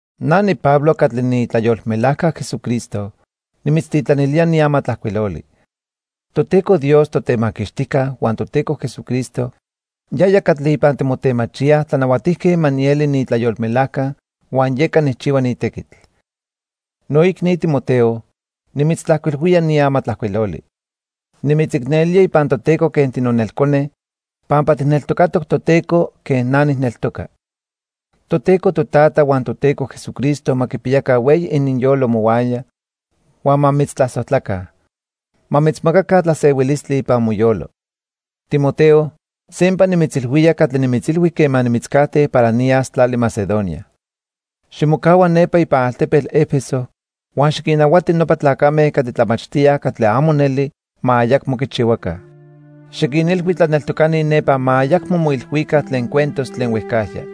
Na niPablo catli niitlayolmelajca Jesucristo nimitztitlanilía ni amatlajcuiloli. Toteco Dios Totemaquixtijca huan Toteco Jesucristo yaya catli ipan timotemachíaj tlanahuatijque ma nieli niitlayolmelajca huan yeca nijchihua ni tequitl. Noicni Timoteo, nimitztlajcuilhuía ni amatlajcuiloli. Nimitzicnelía ipan Toteco quen tinonelcone, pampa tijneltocatoc Toteco quen na nijneltoca. Toteco Totata huan Toteco Jesucristo ma quipiyaca hueyi ininyolo mohuaya huan ma mitztlasojtlaca. Ma mitzmacaca tlasehuilistli ipan moyolo. Timoteo, sempa nimitzilhuía catli nimitzilhui quema nimitzcajte para niyas tlali Macedonia. Ximocahua nepa ipan altepetl 'Efeso huan xiquinnahuati nopa tlacame catli tlamachtíaj catli amo neli ma ayacmo quichihuaca. Xiquinilhui tlaneltocani nepa ma ayacmo moilhuica tlen cuentos tlen huejcajya.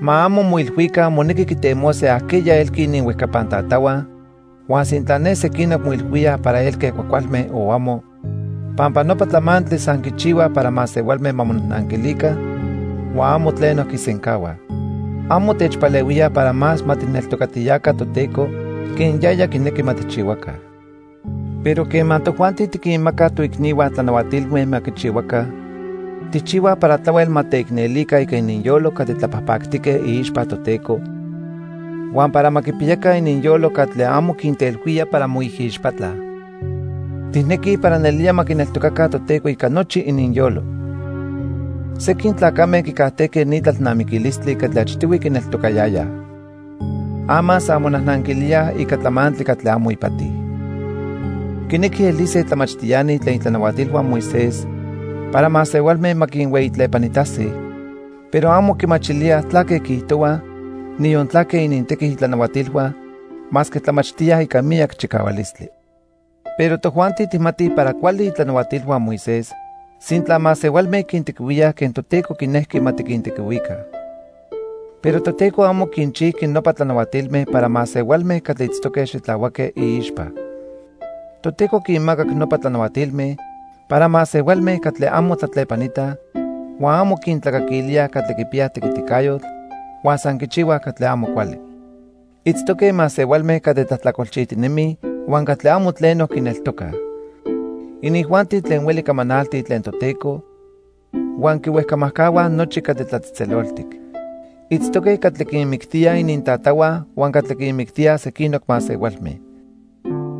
Ma amo moilhuica monequi quitemose ajqueya elqui ininhuejcapan tatahua huan sintla ne sequinoc moilhuíaj para elque cuajcualme o amo, pampa nopa tlamantli san quichihuaj para masehualme ma monajnanquilica huan amo tleno quisencahuaj. Amo techpalehuíaj para más ma tijneltocatiyaca Toteco quen yaya quinequi ma tijchihuaca. Pero quema tojuanti tiquinmacaj toicnihua tlanahuatilme ma quichihuaca, tijchihuaj para tlahuel ma teicnelica ica ininyolo catli tlapajpactique iixpa Toteco huan para ma quipiyaca ininyolo catli amo quintelhuía para moijixpatlaj. Tijnequij para nelía ma quineltocaca Toteco ica nochi ininyolo. Sequin tlacame quicajtejque ni tlalnamiquilistli catli achtihui quineltocayayaj. Ama san monajnanquilíaj ica tlamantli catli amo ipati. Quinequij elise tlamachtiani tlen itlanahuatilhua Moisés para masehualme ma quinhueyitlepanitase, pero amo quimachilíaj tlaque quiijtohuaj, niyon tlaque inintequi itlanahuatilhua masque tlamachtíaj ica miyac chicahualistli. Pero tojuanti tijmatij para cuali itlanahuatilhua Moisés sintla masehualme quintequihuíaj quen Toteco quinejqui ma tiquintequihuica. Pero Toteco amo quinchijqui nopa tlanahuatilme para masehualme catli itztoque xitlahuaque iixpa. Toteco quinmacac nopa tlanahuatilme para masehualme catli amo tlatlepanitaj, huan amo quintlacaquilíaj catli quipiyaj tequiticayotl huan san quichihuaj catli amo cuali. Itztoque masehualme catli tlajtlacolchijtinemij huan catli amo tleno quineltocaj. Inijuanti tlen hueli camanaltij tlen Toteco huan quihuejcamajcahua nochi catli tlatzejtzeloltic. Itztoque catli quinmictíaj inintatahua huan catli quinmictíaj sequinoc masehualme.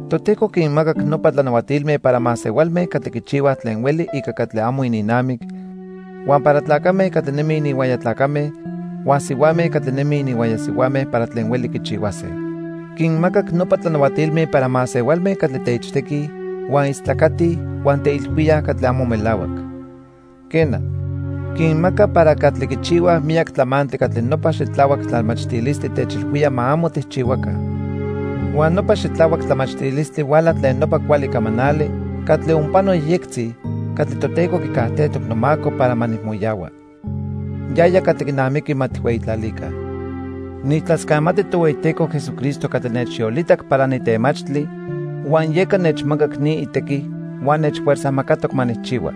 Toteco quinmacac nopa tlanahuatilme para masehualme catli quichihuaj tlen hueli ica catli amo ininnamic, huan para tlacame catli nemij ininhuaya tlacame huan sihuame catli nemij ininhuaya sihuame para tlen hueli quichihuase. Quinmacac nopa tlanahuatilme para masehualme catli teichtequij, huan istlacatij huan teilhuíaj catli amo melahuac. Quena, quinmaca para catli quichihuaj miyac tlamantli catli nopa xitlahuac tlamachtilistli techilhuía ma amo tijchihuaca. Huan nopa xitlahuac tlamachtilistli huala tlen nopa cuali camanali catli onpano yejyectzi catli Toteco quicajtejtoc nomaco para ma nijmoyahua. Yaya catli quinamiqui ma tijhueyitlalica. Nijtlascamati Tohueyiteco Jesucristo catli nechyolitac para nitemachtli huan yeca nechmacac ni itequi huan nechfuerzajmacatoc ma nijchihua.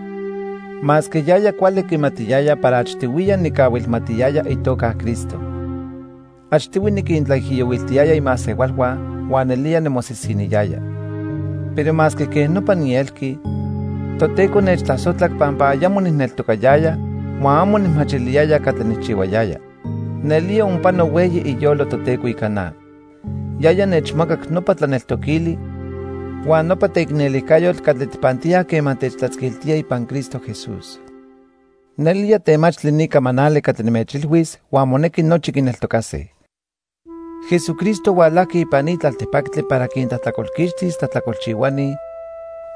Masque yaya cuali quimatiyaya para achtihuiya nicahuilmatiyaya itoca Cristo. Achtihui niquintlaijiyohuiltiyaya imasehualhua huan nelía nimosisiniyaya. Pero masque quej nopa nielqui, Toteco nechtlasojtlac pampa ayamo nijneltocayaya huan amo nijmachiliyaya catli nijchihuayaya. Nelía onpano hueyi iyolo Toteco ica na. Yaya nechmacac nopa tlaneltoquili huan nopa teicnelijcayotl catli tijpantíaj quema techtlatzquiltía ipan Cristo Jesús. Nelía temachtli ni camanali catli nimechilhuis huan monequi nochi quineltocase: Jesucristo hualajqui ipan ni tlaltipactli para quintlajtlacolquixtis tlajtlacolchihuani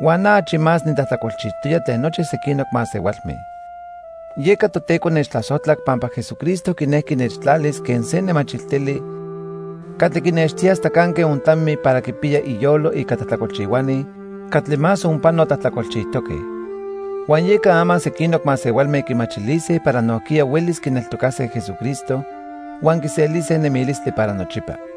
huan na achi más nitlajtlacolchijtoya tlen nochi sequinoc masehualme. Yeca Toteco nechtlasojtlac pampa Jesucristo quinejqui nechtlalis quen se nemachiltili catli quinextía hasta canque ontlami para quipiya iyolo ica tlajtlacolchihuani catli más onpano tlajtlacolchijtoque. Huan yeca ama sequinoc masehualme quimachilise para nojquiya huelis quineltocase Jesucristo huan quiselise nemilistli para nochipa.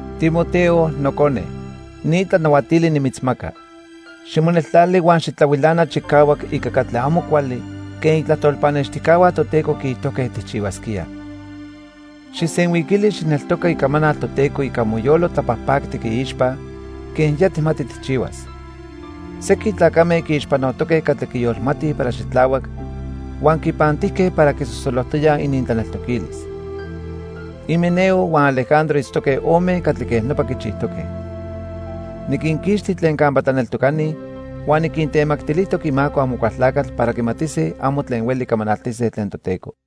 Timoteo, nocone, ni tlanahuatili nimitzmaca. Ximoneltlali huan xitlahuilana chicahuac ica catli amo cuali quen itlajtol pannextijcahua Toteco quiijtojque tijchihuasquía. Xijsenhuiquili xijneltoca icamanal Toteco ica moyolo tlapajpactic iixpa quen ya tijmati tijchihuas. Sequin tlacame quiixpanotoque catli quiyolmatij para xitlahuac huan quinpantijque para quisosolojtoyaj inintlaneltoquilis. Himeneo huan Alejandro itztoque ome catli quej nopa quichijtoque. Niquinquixti tlen campa tlaneltocani huan niquintemactilijtoc imaco Amocualtlacatl para quimatise amo tlen hueli camanaltise tlen Toteco.